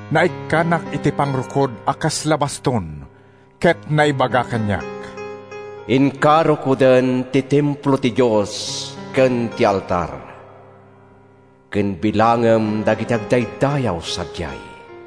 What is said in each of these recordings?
Naikkanak iti pagrukod a kasla baston, ket naibaga kaniak: “Inka rukoden ti templo ti Dios ken ti altar, ken bilangem dagiti agdaydayaw sadiay.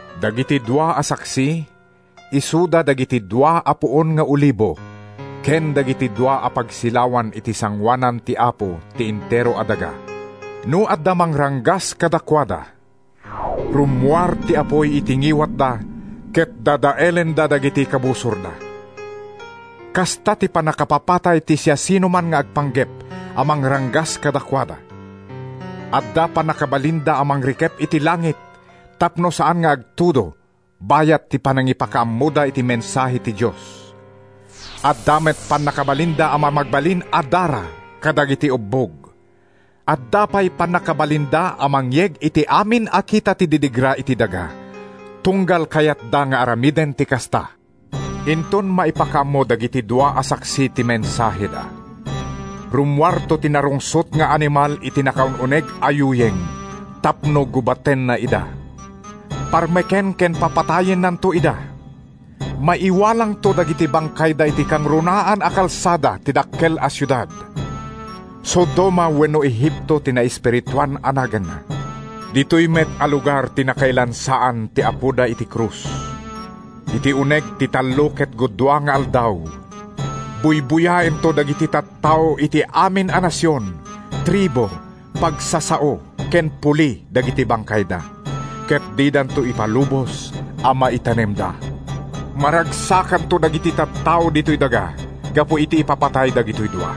Dagiti dua a saksi isuda dagiti dua a puon nga olibo ken dagiti dua a pagsilawan iti sangoanan ti Apo ti entero a daga. No adda mangranggas kadakuada, rummuar ti apuy iti ngiwatda ket dadaelenda dagiti kabusorda. Kasta ti pannakapapatay ti siasinoman nga agpanggep a mangranggas kadakuada. Adda pannakabalinda a mangirikep iti langit tapno saan nga agtudo bayat ti panangipakaammoda iti mensahe ti Dios. Adda met pannakabalinda a mamagbalin a dara kadagiti ubbog. Adda pay pannakabalinda a mangyeg iti amin a kita ti didigra iti daga tunggal kayatda nga aramiden ti kasta. Inton maipakaammo dagiti dua a saksi ti mensaheda, rummuarto ti narungsot nga animal iti nakaun-uneg a yuyeng tapno gubatenna ida. Parmeken ken papatayennanto ida. Maiwalangto dagiti bangkayda iti kangrunaan a kalsada ti dakkel a siudad. Sodoma wenno Egipto ti naespirituan a naganna. Ditoy met a lugar ti nakailansaan ti Apoda iti krus. Iti uneg ti tallo ket gudua nga aldaw, buybuyaento dagiti tattao iti amin a nasion, tribu, pagsasao ken puli dagiti bangkayda, ket didanto ipalubos a maitanemda. Maragsakanto dagiti tattao ditoy daga gapu iti ipapatay dagitoy dua.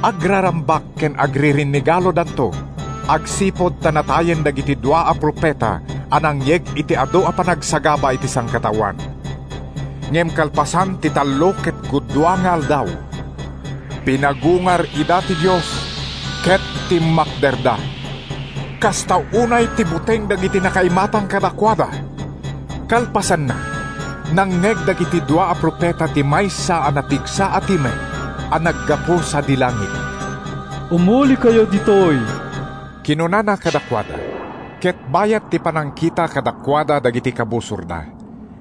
Agrarambak ken agririnnegalodanto agsipud ta natayen dagiti dua a profeta a nangyeg iti adu a panagsagaba iti sangkataoan. Ngem kalpasan ti tallo ket gudua nga aldaw, pinagungar ida ti Dios ket timmakderda. Kasta unay ti buteng dagiti nakaimatang kadakuada. Kalpasanna, nangngeg dagiti dua a profeta ti maysa a napigsa a timek a naggapu sadi langit. “Umulikayo ditoy!” kinunana kadakuada. Ket bayat ti panangkita kadakuada dagiti kabusorda,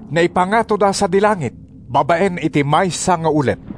naipangatoda sadi langit babaen iti maysa nga ulep.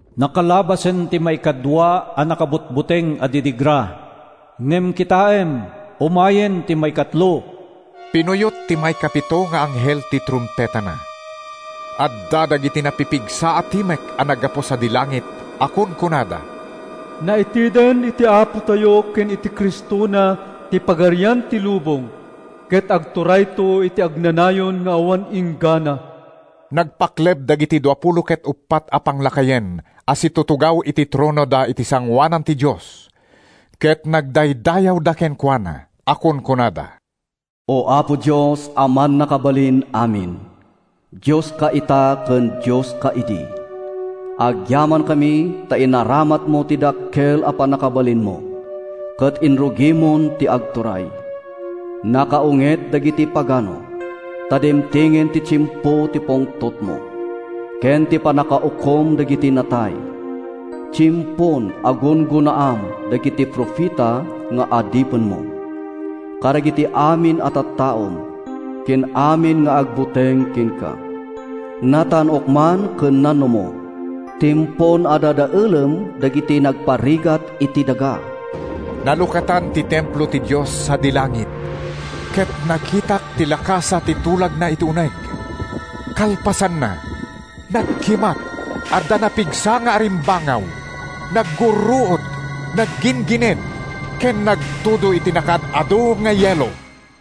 Nakalabasen ti maikadua a nakabutbuteng a didigra. Ngem kitaem, umayen ti maikatlo. Pinuyot ti maikapito nga anghel ti trumpetana. Adda dagiti napipigsa a timek a naggapu sadi langit a kunkunada, “Naiteden iti Apotayo ken iti Cristona ti pagarian ti lubong, ket agturayto iti agnanayon nga awan inggana!” Nagpakleb dagiti duapulo ket uppat a panglakayen a situtugaw iti tronoda iti sangoanan ti Dios ket nagdaydayawda kenkuana a kunkunada: “Apo Dios a Mannakabalin-amin, Dioska ita ken Dioska idi: Agyamankami ta inaramatmo ti dakkel a pannakabalinmo Ket inrugimon ti agturay! Nakaunget dagiti pagano, Ta dimtengen ti tiempo ti pungtotmo, Ken ti pannakaukom dagiti natay. Tiempon a gunggonaam dagiti profeta nga adipenmo, Kadagiti amin a tattaom, ken amin nga agbuteng kenka, Natan-ok man ken nanumo, Tiempon a dadaelem dagiti nangparigat iti daga!” Nalukatan ti templo ti Dios sadi langit, ket nakitak ti Lakasa ti Tulagna iti uneg. Kalpasanna, nagkimat, adda napigsa nga arimbangaw, naggurruod, nagginggined ken nagtudo iti nakaad-adu nga yelo.